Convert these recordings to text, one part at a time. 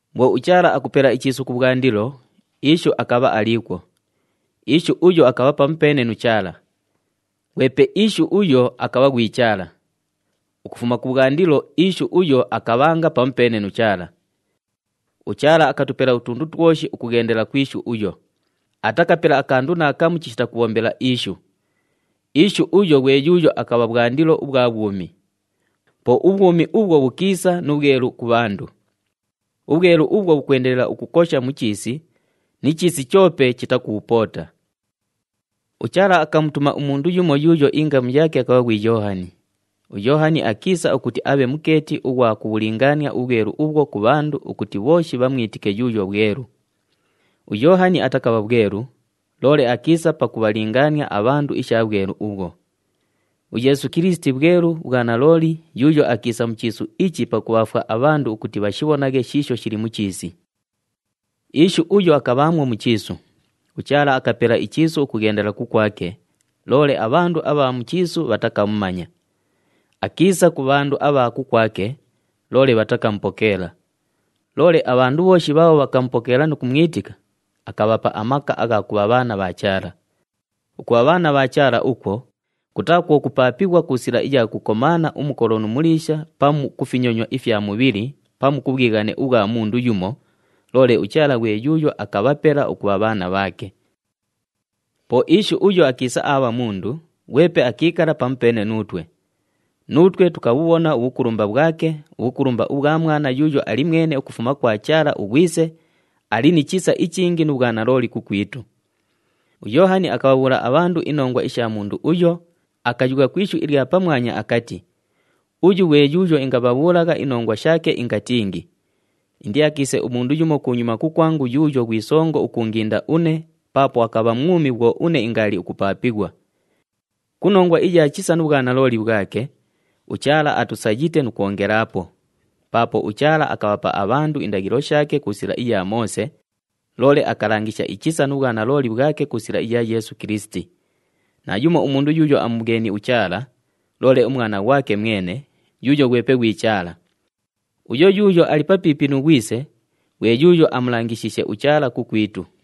Bhwo uChaala akupela ichiisu kubhwandilo, Ishu akabha aliikwo. Ishu uyo akabha pamupeene nu Chaala. Ghwepe Ishu uyo akabha ghwi Chaala. Ukufuma kubhwandilo Ishu uyo akabhanga pamupeene nu Chaala. UChaala akatupela utundu twoshi ukughendela ku Ishu uyo. Atakapela akandu naakamu chishita kubhombela Ishu. Ishu uyo ghwe yuuyo akabha bhwandilo ubhwa bhwumi. Po ubhwumi ubhwo bhukiisa nu bhwelu ku bhandu. Ubhwelu ubhwo bhukwendelela ukukosha mu chiisi, ni chiisi choope chitakubhupoota. UChaala akamutuma umundu yumo yuuyo ingamu yaake akabha ghwi Yoohani. UYoohani akiisa ukuti abhe mukeeti ughwa kubhulingaania ubhwelu ubhwo ku bhandu ukuti bhooshi bhamwitike yuuyo bhwelu. UYoohani atakabha bhwelu, loole akiisa pakubhalingaania abhandu isha bhwelu ubhwo. UYeesu Kilisiti bhwelu bhwa nalooli yuuyo akiisa mu chiisu ichi pakubhaafwa abhandu ukuti bhashibhonaghe shiisho shili mu chiisi. Ishu uyo akabhaamwo mu chiisu. UChaala akapela ichiisu ukughendela kukwake, loole abhandu abha mu chiisu bhatakamumanya. Akiisa ku bhandu abha kukwake, loole bhatakamupokeela. Loole abhandu bhooshi bhaabho bhakamupokeela nu kumwitika, akabhapa amaka agha kubha bhaana bha Chaala. Ukubha bhaana bha Chaala ukwo, kutaa kwo kupaapighwa ku sila iya kukomaana umukolo nu muliisha pamu ku finyonywa ifya mubhili pamu ku bhwighane ubhwa mundu yumo, loole uChaala ghwe yuuyo akabhapela ukubha bhaana bhaake. Po Ishu uyo akiisa aabha mundu, ghwepe akiikala pamupeene nuutwe. Nuutwe tukabhubhona ubhukulumba bhwake, ubhukulumba ubhwa Mwana yuuyo ali mwene ukufuma kwa Chaala uGhwise, ali ni chisa ichingi nu bhwanalooli kukwitu. UYoohani akabhabhuula abhandu inongwa isha mundu uyo, akayugha ku ishu ilya pamwanya akati, “Uyu ghwe yuuyo ingabhabhuulagha inongwa shaake ingatingi, ‘Indiakiise umundu yumo kunyuma kukwangu yuuyo ghwi songo ukuunginda une paapo akabha mwumi bhwo une ingaali ukupaapighwa.’” Ku nongwa iya chisa nu bhwanalooli bhwake, uChaala atusayite nu kwongelaapo. Paapo uChaala akabhapa abhandu indaghilo shaake ku sila iya Moose, loole akalangisha ichisa nu bhwanalooli bhwake ku sila iya Yeesu Kilisiti. Naayumo umundu yuuyo amubhweni uChaala, loole uMwana ghwake mwene, yuuyo ghwepe ghwi Chaala. Uyo yuuyo ali papiipi nu Ghwise, ghwe yuuyo amulangishiishe uChaala kukwitu.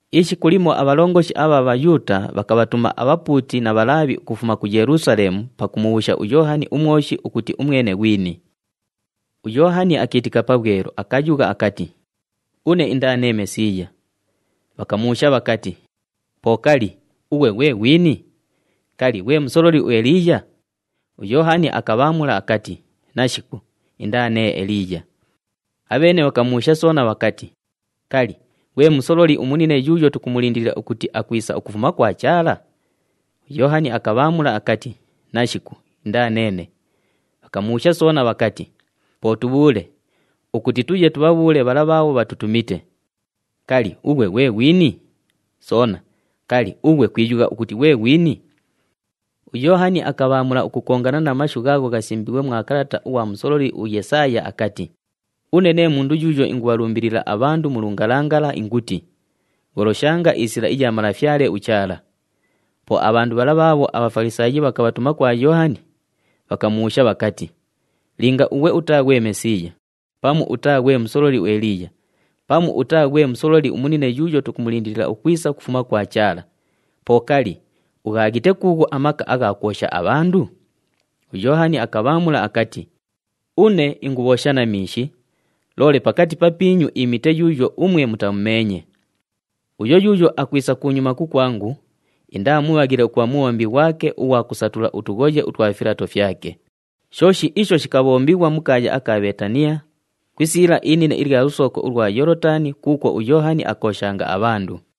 Ishiku limo abhalongoshi abha Bhayuuta bhakabhatuma abhapuuti na Bhalaabhi ukufuma ku Yelusaleemu pakumubhuusha uYoohani uMwoshi ukuti umwene ghwini. UYoohani akiitika pabhwelu, akayugha akati, “Une indaa nee Mesiiya.” Bhakamubhuusha bhakati, “Po kali, ughwe ghwe ghwini? Kali, ghwe musololi uEliiya?” UYoohani akabhaamula akati, “Nashiku, indaa nee Eliiya.” Abheene bhakamubhuusha soona bhakati, “Kali, ghwe musololi umunine yuuyo tukumulindilila ukuti akwisa ukufuma kwa Chaala?” UYoohani akabhaamula akati, “Nashiku, indaa neene.” Bhakamubhuusha soona bhakati, “Po tubhuule ukuti tuye tubhabhuule bhala bhaabho bhatutumite, kali, ughwe ghwe ghwini? Soona, kali, ughwe kwiyugha ukuti ghwe ghwini?” UYoohani akabhaamula ukukongana na mashu ghaagho ghasimbiighwe mwa kalata ughwa musololi uYesaaya akati, “Une nee mundu yuuyo ingubhalumbilila abhandu mu lungalangala inguti, ‘Gholoshanga isila iya Malafyale uChaala.’” Po abhandu bhala bhaabho aBhafalisaayi bhakabhatuma kwa Yoohani, bhakamubhuusha bhakati, “Linga ughwe utaa ghwe Mesiiya, pamu utaa ghwe musololi uEliiya, pamu utaa ghwe musololi umunine yuuyo tukumulindilila ukwisa ukufuma kwa Chaala, po kali, ughaaghite kuughu amaka agha kwosha abhandu?” UYoohani akabhaamula akati, “Une ingubhoosha na miishi, loole pakati papiinyu iimite yuuyo umwe mutamumeenye. Uyo yuuyo akwisa kunyuma kukwangu, indaa mubhaghile ukubha mubhombi ghwake ughwa kusatula utughoye utwa filato fyake.” Shooshi isho shikabhombighwa mu kaaya aka Bheetaniya, ku isiila inine ilya lusooko ulwa Yoolotani kuukwo uYoohani akooshanga abhandu.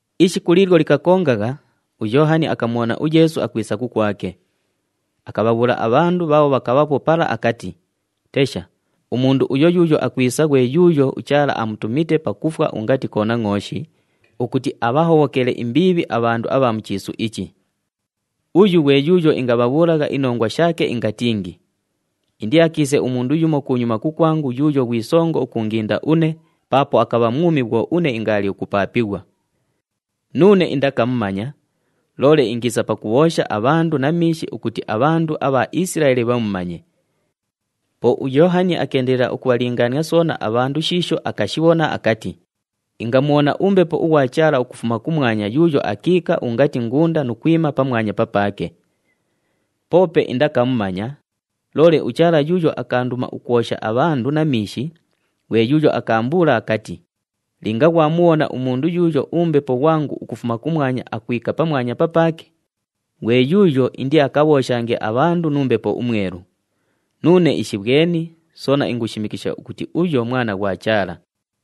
Ishiku liilyo likakongagha, uYoohani akamubhona uYeesu akwisa kukwake. Akabhabhuula abhandu bhaabho bhakabhaapo pala akati, “Tesha, umundu uyo yuuyo akwisa ghwe yuuyo uChaala amutumite pakufwa ungati Konangʼooshi ukuti abhahobhokele imbiibhi abhandu abha mu chiisu ichi! Uyu ghwe yuuyo ingabhabhuulagha inongwa shaake ingatingi, ‘Indiakiise umundu yumo kunyuma kukwangu yuuyo ghwi songo ukuunginda une paapo akabha mwumi bhwo une ingaali ukupaapighwa.’ Nuune indakamumanya, loole ingiisa pakubhoosha abhandu na miishi ukuti abhandu abha Isilaeli bhamumanye.” Po uYoohani akeendelela ukubhalingaania soona abhandu shiisho akashibhona akati, “Ingamubhona uMbepo ughwa Chaala ukufuma kumwanya yuuyo akiika ungati ngunda nu kwima pamwanya papaake. Poope indakamumanya, loole uChaala yuuyo akaanduma ukwosha abhandu na miishi ghwe yuuyo akaambuula akati, ‘Linga ghwamubhona umundu yuuyo uMbepo ghwangu ukufuma kumwanya akwika pamwanya papaake, ghwe yuuyo indiakabhooshange abhandu nu Mbepo uMwelu.’ Nuune ishibhweni, soona ingushimikisha ukuti uyo Mwana ghwa Chaala.”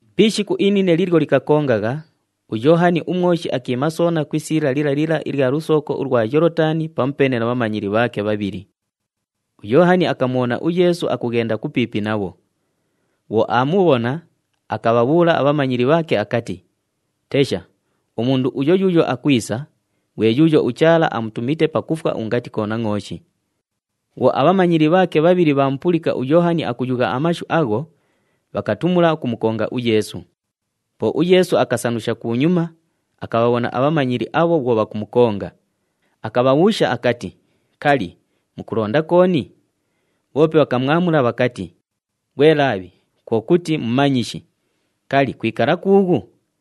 Pi ishiku inine liilyo likakongagha, uYoohani uMwoshi akiima soona ku isiila lila lila ilya lusooko ulwa Yoolotani pamupeene na bhamanyili bhaake bhabhili. UYoohani akamubhona uYeesu akughenda kupiipi nabho. Bhwo aamubhona, akabhabhuula abhamanyili bhaake akati, “Tesha, umundu uyo yuuyo akwisa, ghwe yuuyo uChaala amutumite pakufwa ungati Konangʼooshi.” Bhwo abhamanyili bhaake bhabhili bhaamupulika uYoohani akuyugha amashu agho, bhakatumula ukumukonga uYeesu. Po uYeesu akasanusha kunyuma, akabhabhona abhamanyili abho bhwo bhakumukonga. Akabhabhuusha akati, “Kali, mukulonda kooni?” Bhoope bhakamwamula bhakati, “Ghwe Laabhi (kwo kuti, Mumanyishi), kali, kwikala kuughu?”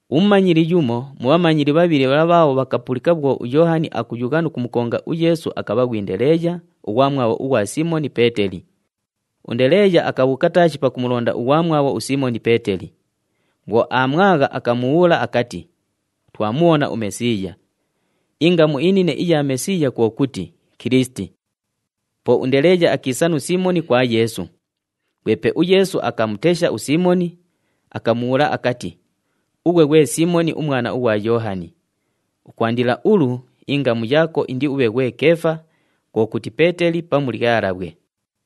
Umumanyili yumo mu bhamanyili bhabhili bhala bhaabho bhakapulika bhwo uYoohani akuyugha nu kumukonga uYeesu akabha ghwi Ndeleeya, ughwamwabho ughwa Siimoni Peeteli. UNdeleeya akabhuuka taashi pakumulonda ughwamwabho uSiimoni Peeteli. Bhwo aamwagha, akamubhuula akati, “Twamubhona uMesiiya!” Ingamu inine ilya Mesiiya kwo kuti, “Kilisiti.” Po uNdeleeya akiisa nu Siimoni kwa Yeesu. Ghwepe uYeesu akamutesha uSiimoni, akamubhuula akati, “Ughwe ghwe Siimoni umwana ughwa Yoohani. Ukwandila ulu, ingamu yaako indiubhe ghwe Keefa,” kwo kuti, “Peeteli” pamu “Lyalabhwe.”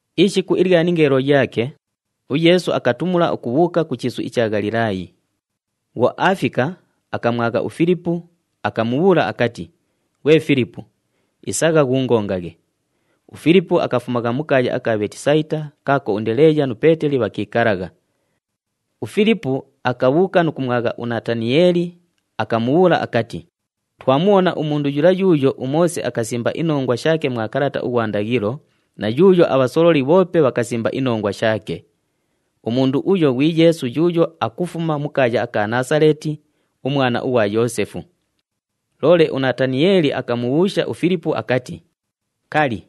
Ishiku ilya ningeelo yaake, uYeesu akatumula ukubhuuka ku chiisu icha Ghalilaayi. Bhwo aafika, akamwagha uFilipu, akamubhuula akati, “Ghwe Filipu, isagha ghuungongaghe.” UFilipu akafumagha mu kaaya aka Bheetisayita kaako uNdeleeya nu Peeteli bhakiikalagha. UFilipu akabhuuka nu kumwagha uNataniyeeli, akamubhuula akati, “Twamubhona umundu yula yuuyo uMoose akasimba inongwa shaake mwa kalata ughwa ndaghilo na yuuyo abhasololi bhoope bhakasimba inongwa shaake. Umundu uyo ghwi Yeesu yuuyo akufuma mu kaaya aka Naasaleeti, umwana ughwa Yoosefu.” Loole uNataniyeeli akamubhuusha uFilipu akati, “Kali,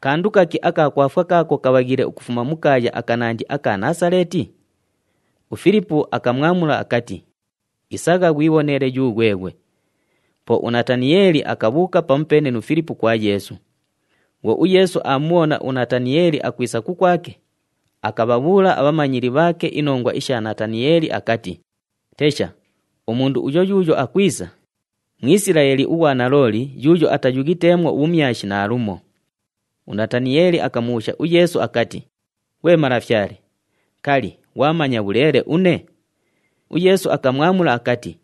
kandu kaki aka kwafwa kaako kabhaghiile ukufuma mu kaaya akanandi aka Naasaleeti?” UFilipu akamwamula akati, “Isagha ghwibhonele yughweghwe.” Po uNataniyeeli akabhuuka pamupeene nu Filipu kwa Yeesu. Bhwo uYeesu aamubhona uNataniyeeli akwisa kukwake, akabhabhuula abhamanyili bhaake inongwa isha Nataniyeeli akati, “Tesha, umundu uyo yuuyo akwisa, Mwisilaeli ughwa nalooli yuuyo atayughiteemwo ubhumyashi naalumo.” UNataniyeeli akamubhuusha uYeesu akati, “Ghwe malafyale, kali, ghwamanya bhuleele une?” UYeesu akamwamula akati,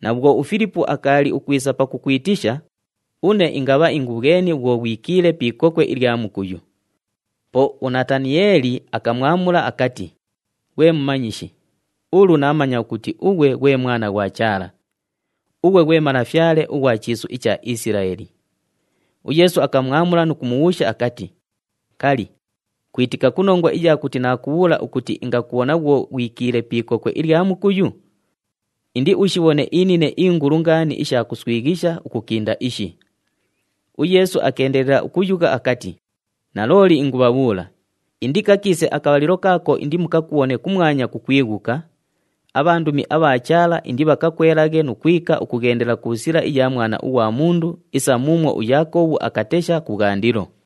“Na bhwo uFilipu akaali ukwisa pakukwitisha, une ingabha ingubhweni bhwo ghwikiile pi ikokwe ilya mukuyu.” Po uNataniyeeli akamwamula akati, “Ghwe Mumanyishi, ulu naamanya ukuti ughwe ghwe Mwana ghwa Chaala! Ughwe ghwe Malafyale ughwa chiisu icha Isilaeli!” UYeesu akamwamula nu kumubhuusha akati, “Kali, kwitika ku nongwa iya kuti naakubhuula ukuti ingakubhona bhwo ghwikiile pi ikokwe ilya mukuyu? Indiushibhone inine ingulu ngaani isha kuswighisha ukukinda ishi!” UYeesu akeendelela ukuyugha akati, “Nalooli ingubhabhuula, indikakiise akabhalilo kaako indimukakubhone kumwanya kukwighuka, abhandumi abha Chaala indibhakakwelaghe nu kwika ukughendela ku sila iya Mwana ughwa Mundu isa muumwo uYaakobhu akatesha kubhwandilo.”